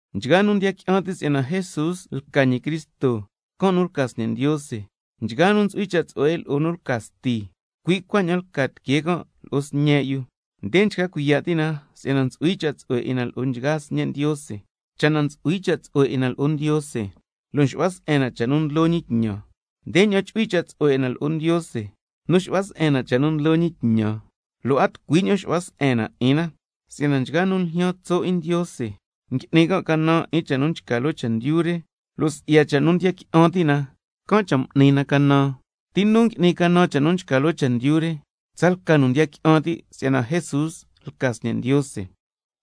Nchgaa nu ndiya qui'an ti' si'yana Jesús lca ñi Cristo, can' nu lca sñe' Ndiose. Nchgaa nu ntsu'hui cha' tsu'hue 'in lo'o nu lca sti, cui' cuaña'an lca tiquee can' lo'o sñe' yu. Nde nchca cuiya' ti' na si'yana ntsu'hui cha' tsu'hue 'in na lo'o nchgaa sñe' Ndiose, cha' na ntsu'hui cha' tsu'hue 'in na lo'o Ndiose, lo' nxu'hua se'en na cha' nu ndlo ñi tñan. Ndeña'an chu'hui cha' tsu'hue 'in na lo'o Ndiose, nu xu'hua se'en na cha' nu ndlo ñi tñan, lo' a tucui ña'an xu'hua se'en na 'in na. Si'yana nchgaa nu ljyaan tso' 'in Ndiose ngui'ni can' canan 'in cha' nu nchca loo chendyu re, lo' si'ya cha' nu ndiya qui'an ti' na, can' cha' m'ni na canan. ¿Ti nu ngui'ni canan 'in cha' nu nchca loo chendyu re? Tsalca nu ndiya qui'an ti' si'yana Jesús lca ñi Sñe' Ndiose.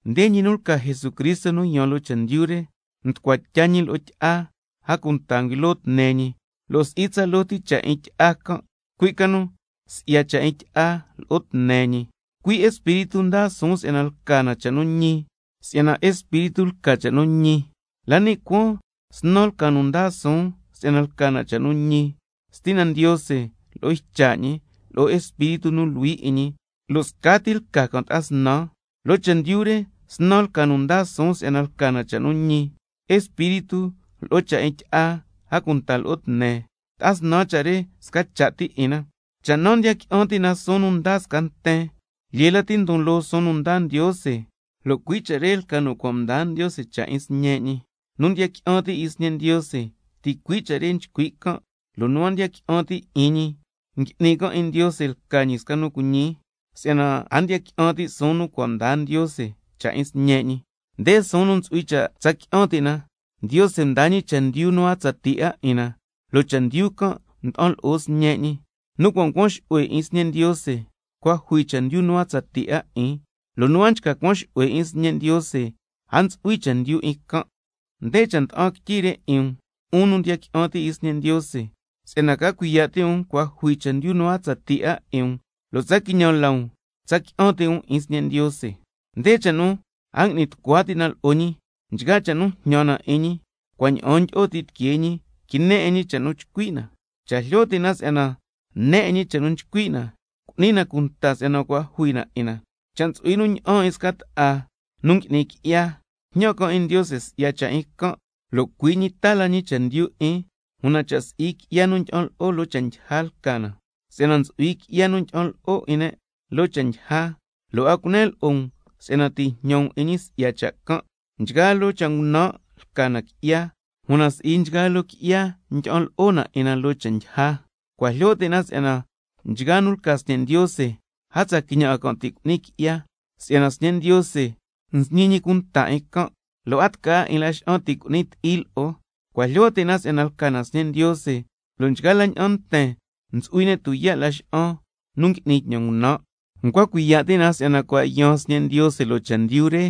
Nde ñi nu lca Jesucristo nu yaan loo chendyu re, mducua tya ñi lo'o tyi'a, a cunta nguilo tne ñi, lo' si'i tsaloo ti cha' 'in tyi'a can', cui' ca nu si'ya cha' 'in tyi'a lo'o tne ñi. Cui' Espíritu ndaa suun si'yana lca na cha' nu ñi, si'yana Espíritu lca cha' nu ñi. La ni' cuaan snan lca nu ndaa suun si'yana lca na cha' nu ñi: Stina Ndiose, lo'o Ycha' ñi, lo'o Espíritu nu Luhui 'in ñi, lo' scati lca can' ta'a snan. Loo chendyu re snan lca nu ndaa suun si'yana lca na cha' nu ñi: Espíritu, lo'o cha' 'in tyi'a, a cunta lo'o tne, ta'a snan cha' re sca cha' ti 'in na. Cha' naa ndiya qui'an ti' na suun nu ndaa sca nten, lyee lati ndon loo suun nu ndaa Ndiose, lo' cui' cha' re lca nu cua' mdaa Ndiose cha' 'in Sñe' ñi. Nu ndiya qui'an ti' 'in Sñe' Ndiose ticui' cha' re nchcui' can', lo' nu a ndiya qui'an ti' 'in ñi, ngui'ni can' 'in Ndiose lca ñi sca nu cuiñi, si'yana a ndiya qui'an ti' suun nu cua' mdaa Ndiose cha' 'in Sñe' ñi. Nde suun nu ntsu'hui cha' tsa qui'an ti' na: Ndiose ndaa ñi chendyu nu a tsatii 'a 'in na, lo' chendyu can' nda'an lo'o Sñe' ñi. Nu cua' ncuan xu'hue 'in Sñe' Ndiose, cua' jui chendyu nu a tsatii 'a 'in, lo' nu a nchca cuan xu'hue 'in Sñe' Ndiose, a ntsu'hui chendyu 'in can'. Nde cha' nda'an quityi re 'in um, 'un nu ndiya qui'an ti' 'in Sñe' Ndiose, si'yana ca cuiya' ti' um cua' jui chendyu nu a tsatii 'a 'in um, lo' tsa quiñan la um tsa qui'an ti' um 'in Sñe' Ndiose. Nde cha' nu a ngui'ni tucua ti' na lo'o ñi: Nchgaa cha' nu jñan na 'in ñi, cua' ña'aan ndyi'o ti tiquee ñi, quine 'in ñi cha' nu chcui' na. Cha' jlyo ti' na si'yana ne 'in ñi cha' nu nchcui' na, cu'ni na cunta si'yana cua' jui na 'in na. Cha' ntsu'hui nu ña'an 'in sca ta'a na ngui'ni qui'ya, jñan can' 'in Ndiose si'ya cha' 'in can', lo' cui' ñi taa la ñi chendyu 'in, una cha' si'i qui'ya nu ndyi'an lo'o 'in loo cha' ndyija lca na. Si'yana ntsu'hui qui'ya nu ndyi'an lo'o 'in ne' loo cha' ndyija, lo' a cunen lo'o um si'yana ti' jñan um 'in ñi si'ya cha' can'. Nchgaa loo cha' ngunan' lca na qui'ya, una si'i nchgaa loo qui'ya ndyi'an lo'o na 'in na loo cha' ndyija. Cua' jlyo ti' na si'yana nchgaa nu lca sñe' Ndiose, a tsa quiñan 'a can' ti' cu'ni qui'ya, si'yana Sñe' Ndiose nsñi ñi cunta 'in can', lo' a tca 'a 'in Laxa'an ti' cu'ni ti'i lo'o. Cua' jlyo ti' na si'yana lca na sñe' Ndiose, lo' nchgaa la ña'an nten ntsu'hui ne' tuyaa' laxa'an nu ngui'ni tñan ngunan'. Ncua cuiya' ti' na si'yana cua' yaan Sñe' Ndiose loo chendyu re,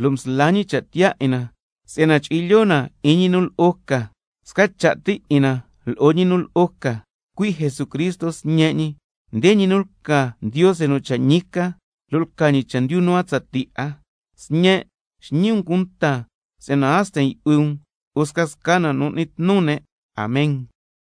lo' msla ñi cha' tiyaa 'in na si'yana chu'hui lyoo na 'in ñi nu lo'o ca, sca cha' ti 'in na lo'o ñi nu lo'o ca, cui' Jesucristo Sñe' ñi. Nde ñi nu lca Ndiose nu cha' ñi ca, lo' lca ñi chendyu nu a tsatii 'a. Sñen', xñi um cunta si'yana a sten yu'hui um lo'o scasca na nu n'ni tnu ne'. Amen.